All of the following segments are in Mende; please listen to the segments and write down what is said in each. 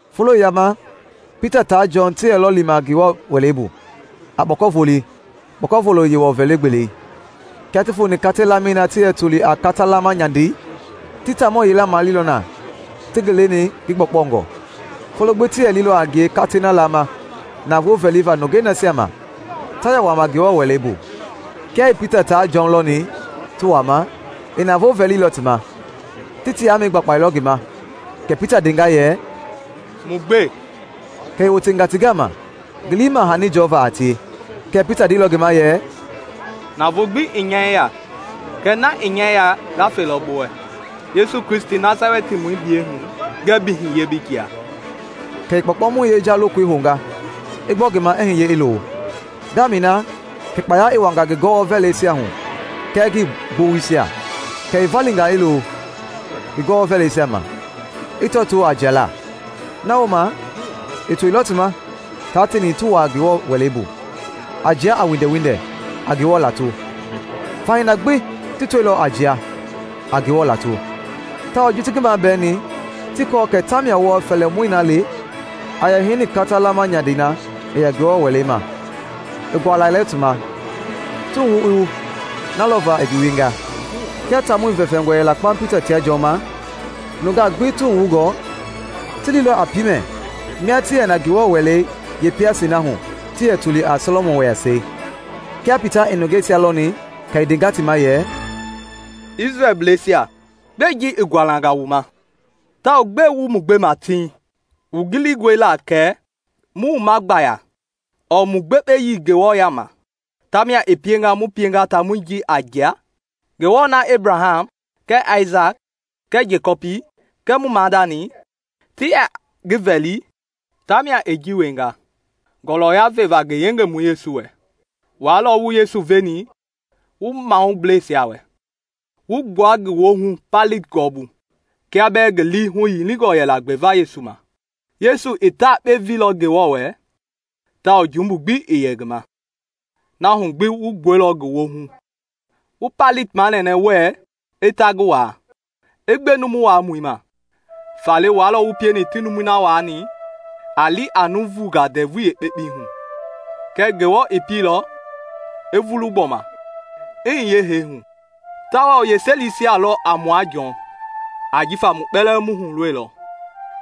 Folo yila ma Pita taa Jɔn ti yɛlɔ lima Ngewɔ Wɛlei bu a kpɔkɔvolei, kpɔkɔvolo Yewɔ vɛli-gbelei. Kia ti foni katei-lamɛi na ti yɛ toli a “Kata-laama Nyandei,” ti taamɔ yila maleilɔ na ti ngi leni ngi gbɔkpɔngɔ. Folo gbi ti yɛ lilɔ a ngie katei na laama navoo vɛliva nungei nasia ma ta yɛ wuaama Ngewɔ Wɛlei bu. Kia i Pita taa Jɔn lɔni ti wuaama, i navoo vɛlilɔ ti ma. Ti ti yaamɛi gbakpailɔ ngi ma; kɛ Pita ndenga yɛ, “Mu gbe!” Kɛ i wotenga ti gama, ngi lii i ma hani jɔva a tie. Kɛɛ Pita ndeilɔ ngi ma yɛ, “Navoo gbi ii nya yeya, kɛɛ na i nya yeya nga felɔ bi wɛ; Yesu Kristi Nasalɛtimɔi biyɛi hu, ngɛɛ bi hiye bi jia!” Kɛ i kpɔɔkpɔmɔi yeja lokoi hounga i gbɔ ngi ma i hiye i lo. Ngaamɛi na kɛ kpaya i wuanga ngi gɔwɔ-vɛlɛisia hu kɛɛ ngi gbowoisia; kɛ i valinga i lo ngi gɔwɔ-vɛlɛisia ma, i tɔtoo a jialaa. Na wooma i toilɔ ti ma taa teeni ti wuaa Ngewɔ Wɛlei bu, a jia a windɛwindɛ, a Ngewɔ lato. Fahii na gbi ti tɔilɔ a jia, a Ngewɔ lato; tawao ji ti ngi mabɛɛni ti kɔɔ kɛ tamia wɔɔ fɛlimɔi na le, a yɛ heini Kata-laama Nyandei na i yɛ Ngewɔ Wɛlei ma, i gualailɔ ti ma, ti wuhu i wu na lɔva i ngi wienga. Kia taamɔi vɛfɛngɔ yɛla kpaŋ Pita tia Jɔn ma, nungaa gbi, ti wuhu wungɔ, ti liilɔ a piimɛ mia ti yɛ na Ngewɔ Wɛlei yeepɛɛyasei na hu ti yɛ toli a “Sɔlɔmɔn Wɛɛyasɛi.” Kia Pita i nungeisia lɔni kɛ i ndenga ti ma yɛ, “Isrɛlbleisia, gbɛe ji i gualanga wu ma? Tawao gbɛe wu ma gbema tiŋ? Wu gilingɔe la kɛ mu wuma gbaya ɔɔ mu gbekpeyii Ngewɔ yaama tamia i pienga mu pienga taamɔi ji a jia? Ngewɔ na Ebraham kɛɛ Aisaki kɛɛ Jekɔpi kɛɛ mu maadani ti yɛ ngi vɛli tamia i ji wienga ngɔlɔya veva ngi Yengemɔi Yesu wɛ. Wua lɔ wu Yesu veni wu mahubleisia wɛ, wu gbua ngi woohu Paileti gɔɔbu kia bɛɛ ngi lii huyilingɔ yɛla gbeva Yesu ma. Yesu i ta yekpe veilɔ Ngewɔ wɛ tawao jumbu gbi ii yɛ ngi ma, na hu gbi wu gbuɛilɔ ngi woohu wu Paileti manɛnɛ wɛɛ i ta ngi waa, i gbe numu waamɔi ma. Faale wua lɔ wu pieni ti numui na waani a li a nuuvungaa ndɛvui yeekpekpei hu. Kɛɛ Ngewɔ i pieilɔ i vulu gbɔma i hiye hee hu tawao yeeselisia lɔ a mua Jɔn; ajifa mu kpɛlɛɛ mu hulɔilɔ.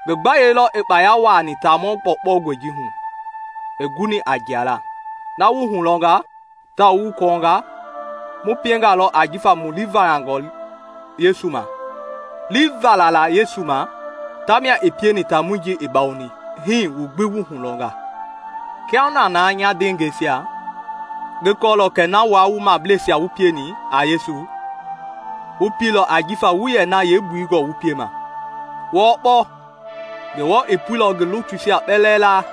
Ngi gbayei lɔ i kpaya wuaani taamɔ Gbɔkpɔngɔi ji hu i guni a jialaa. Na wu hulɔnga tawao wu kɔɔnga, mu piengalɔ ajifa mu lii valangɔ Yesu ma; lii fala la Yesu ma tamia i pieni taamɔi ji i bawoni hii wu gbi wu hulɔnga. “Kiahuna na, nya ndeengɛisia, ngi kɔɔlɔ kɛ na wua wu mahubleisia wu pieni a Yesu, wu pieilɔ ajifa wuii yɛ na yeembui gɔɔ wu piema. Wɔɔ kpɔɔkpɔ, Ngewɔ i puilɔ ngi lutuisia kpɛlɛɛ laa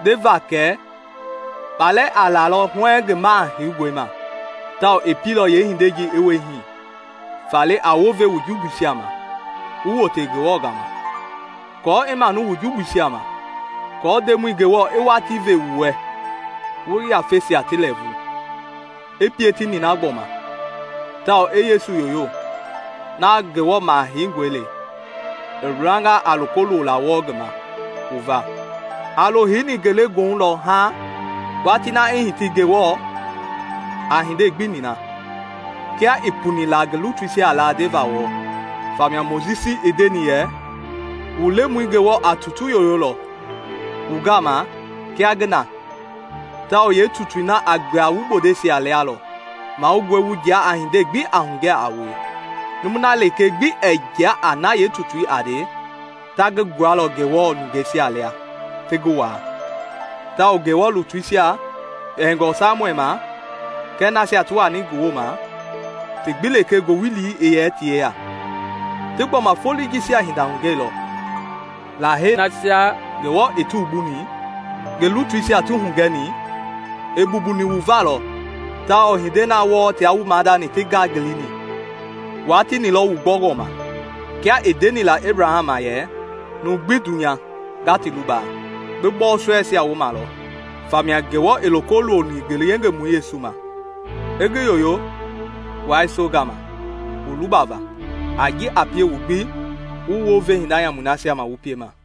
ndeva leeŋ kɛ kpalɛ a lalɔ huɛɛŋ ngi Maha Heingɔi ma, tawao i pieilɔ yeehindei i wie hii. Faale, a wounve wu jumbuisia ma wu wote Ngewɔ gama, aako i manu wu jumbuisia ma, aako Ndemɔi Ngewɔ i watii ve wu wɛ wu yafeisia ti lɛɛvu, i pie ti nina gbɔma tawao i Yesu yoyo, na Ngewɔ Maha Heingɔi le i wilanga a loko lola wɔɔ ngi ma wu va. A lo heini ngelegoohu lɔ haaŋ watii na i hiti Ngewɔ a hindei gbi nina, kia i puni la ngi lutuisia laa ndeva wɔɔ. Famia Mojisi i ndeni yɛ, ‘Wu Lemɔi Ngewɔ a tutu yoyolɔ wu gama kia ngi na tawao yeetutui na a gbua wu bondeisia lia lɔ. Mahoungɔe wu jia a hindei gbi a hugɛ a wue. Numui na lekee gbi ɛɛ jia a na yeetutui a nde, ta ngi gbualɔ Ngewɔ nungeisia lia ti ngi waa.’ Tawao Ngewɔ lutuisia, kpɛngɔ Samuɛl ma kɛɛ nasia ti wani ngi wooma, ti gbi lekee ngowili i yɛ ti yeya, ti gbɔma foloi jisia hinda hugɛilɔ. Lahei nasia Ngewɔ i ti wumbuni, ngi lutuisia ti hugɛni, i mbumbuni wu va lɔ tawao hindei na wɔɔ tia wu maadani ti ngangilini, wua tieni lɔ wu gbɔngɔ ma. Kia i ndeni la Ebraham ma yɛ, ‘Numui gbi dunya nga ti luba bi bɔɔsɔɛisia wooma lɔ.’ Famia Ngewɔ i loko loni ngi Yengemɔi Yesu ma, i ngi yoyo wua yese gama wu lubava a ji a pie wu gbi wu wounve hinda nyamui nasia ma wu piema.”